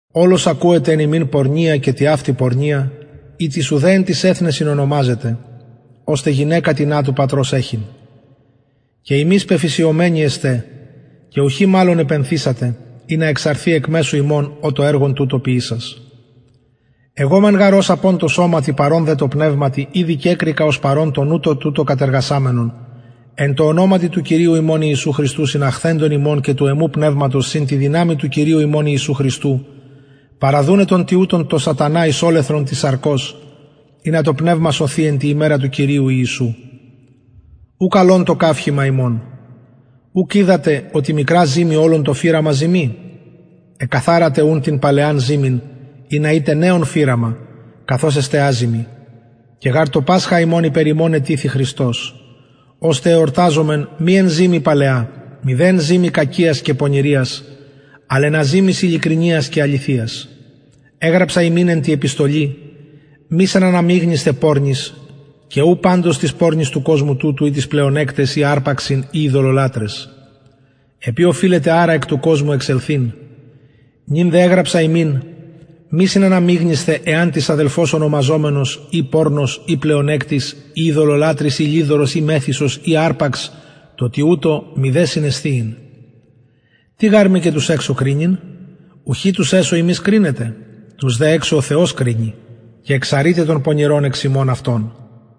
ολως ακουεται εν υμιν πορνεια και τοιαυτη πορνεια ητις ουδε εν τοις εθνεσιν ονομαζεται ωστε γυναικα τινα του πατρος εχειν και υμεις πεφυσιωμενοι εστε και ουχι μαλλον επενθησατε ινα εξαρθη εκ μεσου υμων ο το εργον τουτο ποιησας εγω μεν γαρ ως απων τω σωματι παρων δε τω πνευματι ηδη κεκρικα ως παρων τον ουτως τουτο κατεργασαμενον εν τω ονοματι του κυριου ημων ιησου χριστου συναχθεντων υμων και του εμου πνευματος συν τη δυναμει του κυριου ημων ιησου χριστου παραδουναι τον τοιουτον τω σατανα εις ολεθρον της σαρκος ινα το πνευμα σωθη εν τη ημερα του κυριου ιησου ου καλον το καυχημα υμων ουκ οιδατε οτι μικρα ζυμη ολον το φυραμα ζυμοι εκκαθαρατε την παλαιαν ζυμην ινα ητε νεον φυραμα καθως εστε αζυμοι και γαρ το πασχα ημων υπερ ημων ετυθη χριστος ωστε εορταζωμεν μη εν ζυμη παλαια μηδε εν ζυμη κακιας και πονηριας αλλ εν αζυμοις ειλικρινειας και αληθειας εγραψα υμιν εν τη επιστολη μη συναναμιγνυσθαι πορνοις και ου παντως τοις πορνοις του κοσμου τουτου η τοις πλεονεκταις η αρπαξιν η ειδωλολατραις επει οφειλετε αρα εκ του κοσμου εξελθειν νυν δε εγραψα υμιν μη συναναμιγνυσθαι εαν τις αδελφος ονομαζομενος η πορνος η πλεονεκτης η ειδωλολατρης η λοιδορος η μεθυσος η αρπαξ τω τοιουτω μηδε συνεσθιειν τι γαρ μοι και τους εξω κρινειν ουχι τους εσω υμεις κρινετε τους δε εξω ο θεος κρινει και εξαρειτε τον πονηρον εξ υμων αυτων